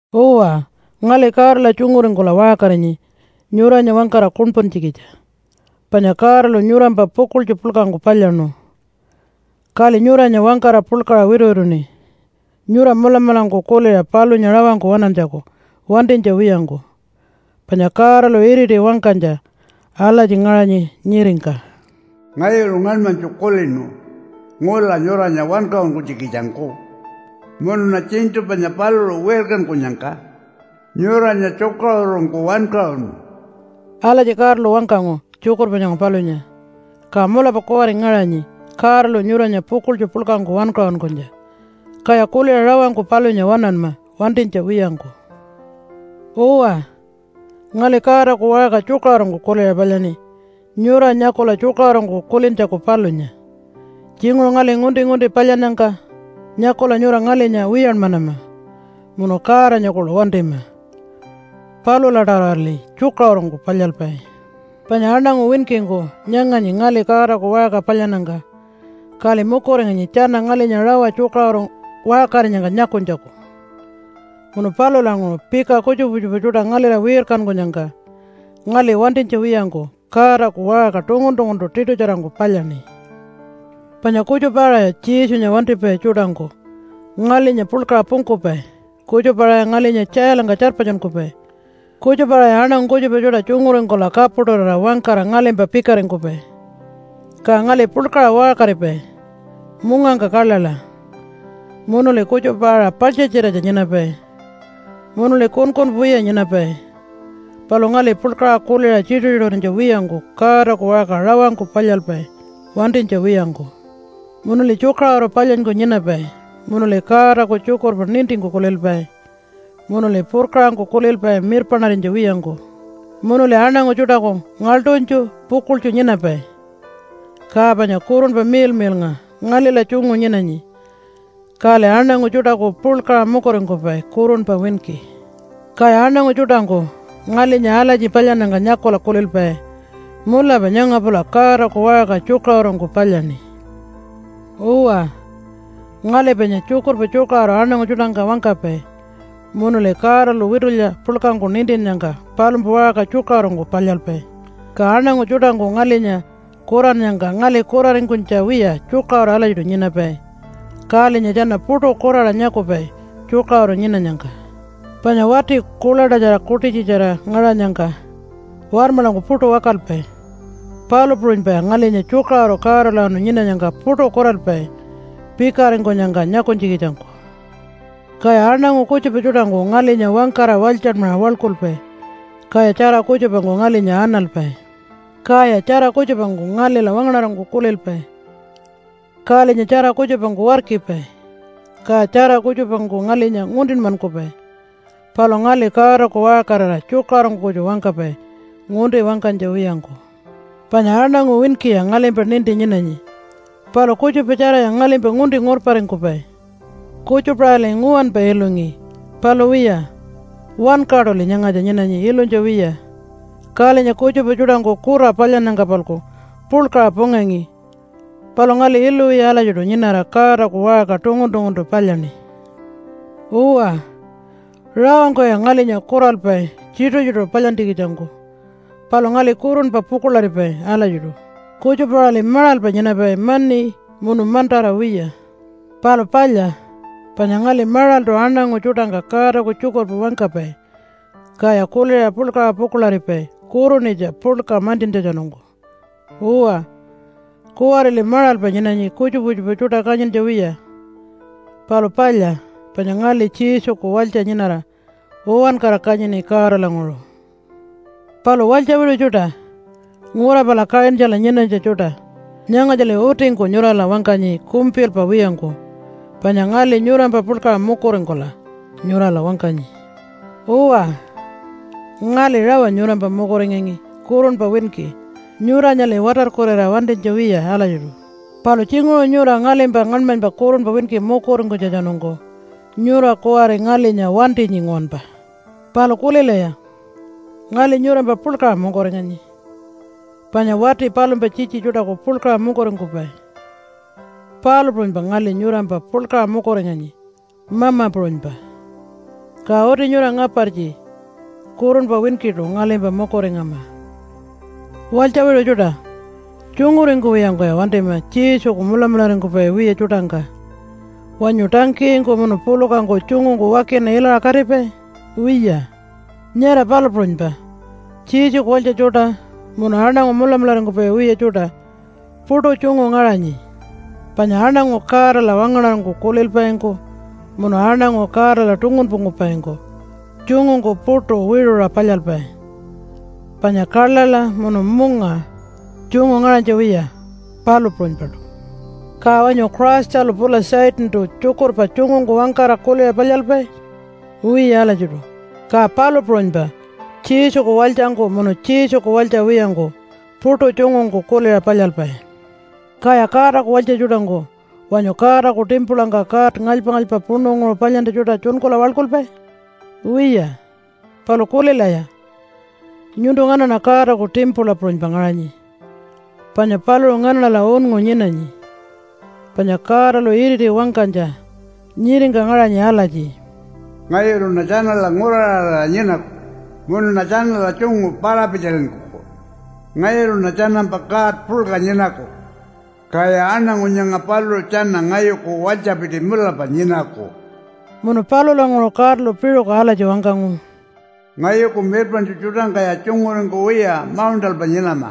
Uwa, ngali Godala tjunguringkula waṟkarinyi nyuranya wangkara kuṉpuntjikitja. Panya Godalu nyurampa pukuḻtju puḻkangku palyaṉu, kali nyuranya wangkara puḻkaṟa wituwituṉi nyura mulamulangku kuliṟa palunya rawangku waṉantjaku wantinytja wiyangku. Panya Godalu iriti wangkanytja alatji ngaṟanyi nyiringka, “Ngayulu ngaṉmanytju kulinu ngula nyuranya wankaṟunkunytjikitjangku. Munuṉa tjiṉṯu panya paluṟu wirkankunyangka nyuranya tjukaṟurungku wankaṟunu.” Alatji Godalu wangkangu tjukurpa nyanga palunya. Ka mulapa kuwari ngaṟanyi Godalu nyuranya pukuḻtju puḻkangku wankaṟunkunytja. Kaya kuliṟa rawangku palunya waṉanma wantinytja wiyangku. Uwa, ngali Godaku waṟka tjukaṟurungku kuliṟa palyaṉi nyura nyakula tjukaṟurungku kulintjaku palunya. Tjinguṟu ngali ngunti-ngunti palyannyangka nyakula nyura ngalinya wiyanmanama munu Godanya kuḻu wantima. Palula-tawarali tjukaṟurungku palyalpai. Panya aṉangu winkingku nyanganyi ngali Godaku waṟka palyannyangka, kali mukuringanyi tjana ngalinya rawa tjukaṟuru waṟkarinyangka nyakunytjaku. Munu palulanguṟu pika kutjupa kutjupa tjuṯa ngalila wirkankunyangka ngali wantinytja wiyangku Godaku waṟka tungun-tunguntu tiṯutjarangku palyaṉi. Panya kutjupa-aṟaya Jesunya wantipai tjuṯangku ngalinya puḻkaṟa pungkupai, kutjupa-aṟaya ngalinya tjailangka tjarpatjunkupai, kutjupa-aṟaya aṉangu kutjupa tjuṯa tjunguringkula kapuṯurira wangkara ngalimpa pikaringkupai. Ka ngali puḻkaṟa waṟkaripai mungangka kaḻaḻa, munuli kutjupa-aṟa paḻtjatjiratja nyinapai munuli kunkunpa wiya nyinapai. Palu ngali puḻkaṟa kuliṟa tjituṟu-tjituṟurinytja wiyangku Godaku waṟka rawangku palyalpai wantinytja wiyangku. Munuli tjukaṟuru palyanyku nyinapai munuli Godaku tjukurpa nintingku kulilpai, munuli purkaṟangku kulilpai mirpaṉarinytja wiyangku, munuli aṉangu tjuṯaku ngaḻṯunytju pukuḻtju nyinapai. Ka panya Kurunpa Miḻmiḻnga ngalila tjungu nyinanyi, kali aṉangu tjuṯaku puḻkaṟa mukuringkupai kurunpa winki. Kaya aṉangu tjuṯangku ngalinya alatji palyannyangka nyakula kulilpai, “Mulapa nyanga pula Godaku waṟka tjukaṟurungku palyaṉi.” Uwa, ngali panya tjukurpa tjukaṟuru aṉangu tjuṯangka wangkapai, munuli Godalu witulya puḻkangku nintinnyangka palumpa waṟka tjukaṟurungku palyalpai. Ka aṉangu tjuṯangku ngalinya kurannyangka ngali kuraringkunytja wiya tjukaṟuru alatjiṯu nyinapai, kalinya tjana puṯu kuraṟa nyakupai tjukaṟuru nyinanyangka. Panya wati kuḻaṯatjara kuṯitjitjara ngaṟanyangka warmaḻangku puṯu wakalpai, palu puṟunypaya ngalinya tjukaṟuru Godalawanu nyinanyangka puṯu kuralpai pikaringkunyangka nyakunytjikitjangku. Kaya aṉangu kutjupa tjuṯangku ngalinya wangkara walytjanmaṟa waḻkulpai. Kaya tjara kutjupangku ngalinya analpai. Kaya tjara kutjupangku ngalila wangaṉarangku kulilpai. Kalinya tjara kutjupangku warkipai, kaya tjara kutjupangku ngalinya nguntinmankupai, palu ngali Godaku waṟkarira tjukaṟurungku kutju wangkapai ngunti wangkanytja wiyangku. Panya aṉangu winkiya ngalimpa ninti nyinanyi, palu kutjupa tjaraya ngalimpa ngunti ngurparingkupai. Kutjupa-aṟali nguwanpa ilungi, palu wiya, wankaṯuli nyangatja nyinanyi ilunytja wiya. Kalinya kutjupa tjuṯangku kura palyannyangka-palku puḻkaṟa pungangi, palu ngali ilu wiya alatjiṯu nyinara Godaku waṟka tungun-tunguntu palyaṉi. Uwa, rawangkuya ngalinya kuralpai tjituṟu-tjituṟu palyantjikitjangku, palu ngali kurunpa pukuḻaripai alatjiṯu. Kutjupa-aṟali maṟalpa nyinapai mani munu mantara wiya. Palu palya, panya ngali maṟaltu aṉangu tjuṯangka Godaku tjukurpa wangkapai, kaya kuliṟa puḻkaṟa pukuḻaripai kurunitja puḻka mantjintjatjanungku. Uwa, kuwarili maṟalpa nyinanyi kutjupa kutjupa tjuṯa kanyintja wiya, palu palya panya ngali Jesuku walytja nyinara uwankara kanyini Godalanguṟu. Palu walytja wiṟu tjuṯa, ngura pala Kaṟintjala nyinanytja tjuṯa! Nyangatjali utingku nyurala wangkanyi kumpilpa wiyangku, panya ngali nyurampa puḻkaṟa mukuringkula nyurala wangkanyi. Uwa, ngali rawa nyurampa mukuringangi kurunpa winki, nyuranyali watarkurira wantinytja wiya alatjiṯu. Palu tjinguṟu nyura ngalimpa ngaṉmanypa kurunpa winki mukuringkunytjatjanungku nyura kuwari ngalinya wantinyi nguwanpa. Palu kulilaya! Ngali nyurampa puḻkaṟa mukuringanyi, panya wati palumpa tjitji tjuṯaku puḻkaṟa mukuringkupai, palu puṟunypa ngali nyurampa puḻkaṟa mukuringanyi mama puṟunypa. Ka uti nyura ngapartji kurunpa winkiṯu ngalimpa mukuringama. Walytja wiṟu tjuṯa! Tjunguringkuwiyangkuya wantima Jesuku mulamularingkupai wiya tjuṯangka! Wanyu tangkiyingku munu pulukangku tjungungku wakina ilaṟa katipai? Wiya. Nyara palu puṟunypa Jesuku walytja tjuṯa munu aṉangu mulamularingkupai wiya tjuṯa puṯu tjungu ngaṟanyi. Panya aṉangu Godala wangaṉarangku kulilpaingku munu aṉangu Godala tungunpungkupaingku tjungungku puṯu wiṟuṟa palyalpai. Panya kaḻaḻa munu munga tjungu ngaṟanytja wiya, palu puṟunypaṯu. Ka wanyu Christalu pula Satantu tjukurpa tjungungku wangkara kuliṟa palyalpai? Wiya alatjiṯu. Ka palu puṟunypa Jesuku walytjangku munu Jesuku walytja wiyangku puṯu tjungungku kuliṟa palyalpai. Kaya Godaku walytja tjuṯangku wanyu Godaku timpulangka god ngalypa-ngalypa puṉunguṟu palyantja tjuṯa tjunkula waḻkulpai? Wiya. Palu kulilaya! Nyuntu nganaṉa Godaku timpula puṟunypa ngaṟanyi, panya paluṟu nganaṉala unngu nyinanyi. Panya Godalu iriti wangkanytja nyiringka ngaṟanyi alatji, “Ngayuluṉa tjanala nguraṟarira nyinaku, munuṉa tjanala tjungu para-pitjalinkuku. Ngayuluṉa tjanampa God puḻka nyinaku, kaya aṉangu nyanga paluṟu tjana ngayuku walytjapiti mulapa nyinaku.” Munu palulanguṟu Godalu piṟuku alatji wangkangu, “Ngayuku mirpaṉtju tjuṯangkaya tjunguringkuwiya mauṉṯalpa nyinama.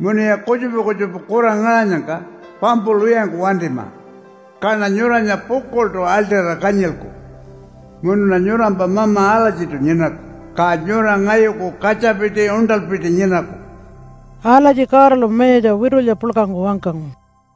Munuya kutjupa kutjupa kura ngaṟanyangka pampulwiyangku wantima. Kaṉa nyuranya pukuḻṯu aḻṯira kanyilku. Munuṉa nyurampa Mama alatjiṯu nyinaku. Ka nyura ngayuku katjapiti uṉṯalpiti nyinaku.” Alatji Godalu mayatja witulya puḻkangku wangkangu.